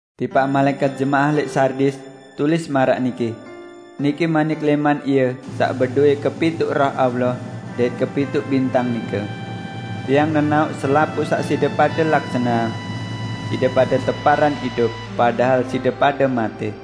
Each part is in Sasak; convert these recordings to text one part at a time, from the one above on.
"Tipaq malaẽkat jemaah lẽq Sardis, tulis maraq niki: Niki manik lẽman Ie saq bedowẽ kepituq Roh Allah dait kepituq bintang nike. Tiang nenaoq selapuq saq side pade laksaneang. Side pade teparan idup, padahal side pade matẽ!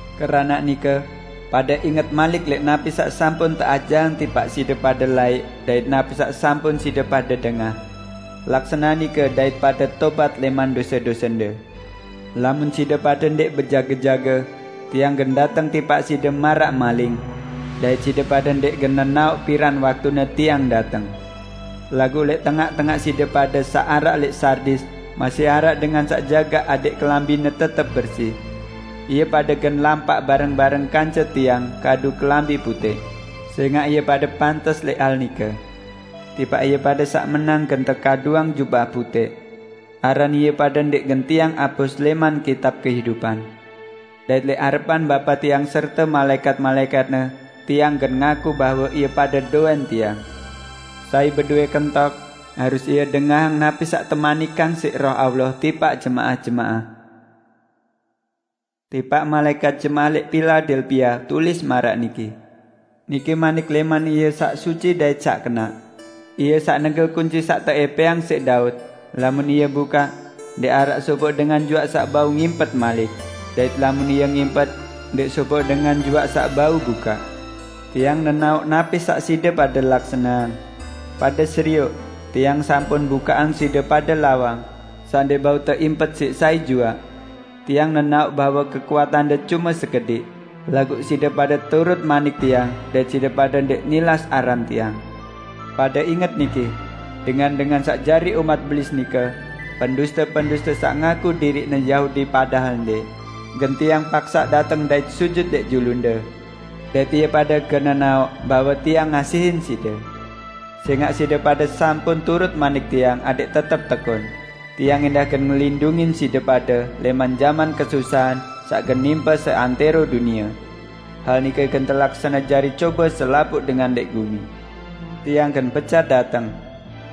Keranaq nike, pade inget malik lẽq napi saq sampun teajahang tipaq side pade laẽq dait napi saq sampun side pade dengah. Laksaneang nike dait pade tobat lẽman dose-dosende. Lamun side pade ndẽq bejage-jage, Tiang gen dateng tipaq side maraq maling; dait side pade ndẽq gen nenaoq piran waktune Tiang dateng. Laguq lẽq tengaq-tengaq side pade saq araq lẽq Sardis masih araq dengan saq jagaq adẽq kelambine tetep bersi. Ie pade gen lampaq bareng-bareng kance Tiang kadu kelambi putẽq, sẽngaq ie pade pantes lẽq hal nike. Tipaq ie pade saq menang gen tekaduang jubah putẽq. Aran ie pade ndẽq gen Tiang apus lẽman kitab kehidupan. Dait lẽq arepan Bapa Tiang serte malaẽkat-malaẽkat-Ne Tiang gen ngaku bahwe ie pade dowẽn Tiang. Sai bedowẽ kentok, harus ie dengahang napi saq temanikang siq Roh Allah tipaq jemaah-jemaah!" "Tipaq malaẽkat jemaah lẽq Piladelpia, tulis maraq niki: Niki manik lẽman Ie Saq Suci dait Saq Kenaq. Ie saq negel kunci saq teẽpẽang siq Daud; lamun Ie bukaq, ndẽq araq sopoq dengan juaq saq bau ngimpet malik, dait lamun Ie ngimpet, ndẽq sopoq dengan juaq saq bau bukaq. Tiang nenaoq napi saq side pade laksaneang: Pade serioq, Tiang sampun bukaqang side pade lawang, saq ndẽq bau teimpet siq sai juaq. Tiang nenaoq bahwe kekuatande cume sekediq, laguq side pade turut manik Tiang dait side pade ndẽq nilas aran Tiang. Pade inget niki: Dengan-dengan saq jari umat Belis nike, penduste-penduste saq ngaku diriqne Yahudi padahal ndẽq, gen Tiang paksaq dateng dait sujut lẽq julunde. Dait ie pade gen nenaoq bahwe Tiang ngasihin side. Sẽngaq side pade sampun turut manik Tiang adẽq tetep tekun, Tiang ẽndah gen ngelindungin side pade lẽman jaman kesusahan saq gen nimpe seantẽro dunie. Hal nike gen telaksane jari cobe selapuq dengan lẽq gumi. Tiang gen becat dateng!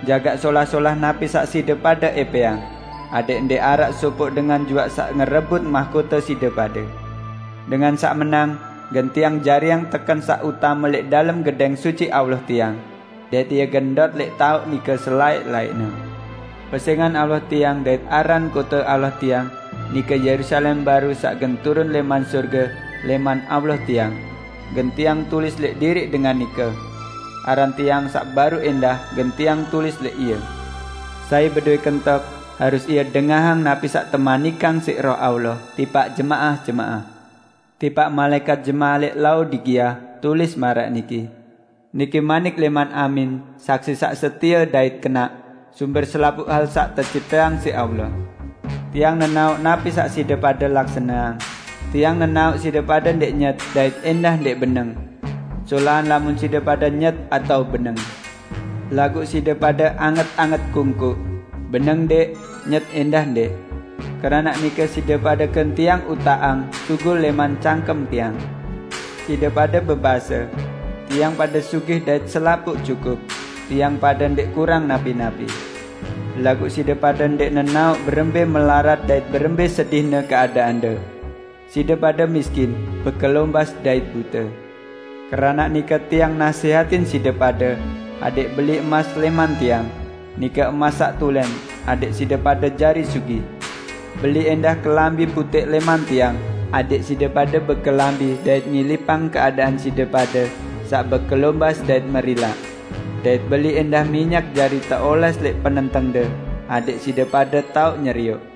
Jagaq solah-solah napi saq side pade ẽpẽang, adẽq ndẽq araq sopoq dengan juaq saq ngerebut mahkote side pade. Dengan saq menang, gen Tiang jariang teken saq utame lẽq dalem Gedẽng Suci Allah Tiang, dait ie gen ndot lẽq taoq nike selaẽq-laẽqne. Pesẽngan Allah Tiang dait aran kote Allah Tiang -- nike Yerusalem baru saq gen turun lẽman sorge, lẽman Allah Tiang -- gen Tiang tulis lẽq diriq dengan nike. Aran Tiang saq baru ẽndah gen Tiang tulis lẽq ie. Sai bedowẽ kentok, harus ie dengahang napi saq temanikang siq Roh Allah tipaq jemaah-jemaah!" "Tipaq malaẽkat jemaah lẽq Laodikia, tulis maraq niki: Niki manik lẽman Amin, Saksi saq setie dait kenaq, sumber selapuq hal saq tecipteang siq Allah. Tiang nenaoq napi saq side pade laksaneang; Tiang nenaoq side pade ndẽq nyet dait ẽndah ndẽq beneng. Solahan lamun side pade nyet atao beneng! Laguq side pade anget-anget kungkuq; beneng ndẽq, nyet ẽndah ndẽq. Keranaq nike side pade gen Tiang utaqang sugul lẽman cangkem Tiang. Side pade bebase, 'Tiang pade sugih dait selapuq cukup; tiang pade ndẽq kurang napi-napi!' Laguq side pade ndẽq nenaoq berembẽ melarat dait berembẽ sedihne keadaande! Side pade miskin, bekelombas, dait bute. Keranaq nike Tiang nasẽhatin side pade adẽq beli emas lẽman Tiang, nike emas saq tulẽn, adẽq side pade jari sugih. Beli ẽndah kelambi putẽq lẽman Tiang adẽq side pade bekelambi dait ngilipang keadaan side pade saq bekelombas dait merilaq. Dait beli ẽndah minyak jari teolẽs lẽq penentengde adẽq side pade tao nyerioq.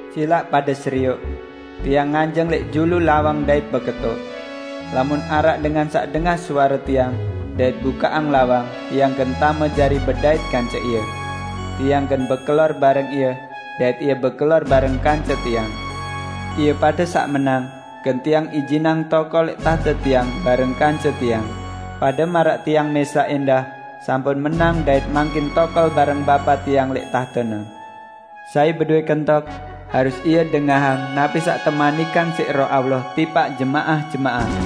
Silaq pade serioq! Tiang nganjeng lẽq julu lawang dait beketok. Lamun araq dengan saq dengah suare Tiang dait bukaqang lawang, Tiang gen tame jari bedait kance ie; Tiang gen bekelor bareng ie, dait ie bekelor bareng kance Tiang. Ie pade saq menang, gen Tiang ijinang tokol lẽq tahte Tiang bareng kance Tiang, pade maraq Tiang mẽsaq ẽndah sampun menang dait mangkin tokol bareng Bapa Tiang lẽq tahte-Ne. Sai bedowẽ kentok, harus ie dengahang napi saq temanikang siq Roh Allah tipaq jemaah-jemaah!"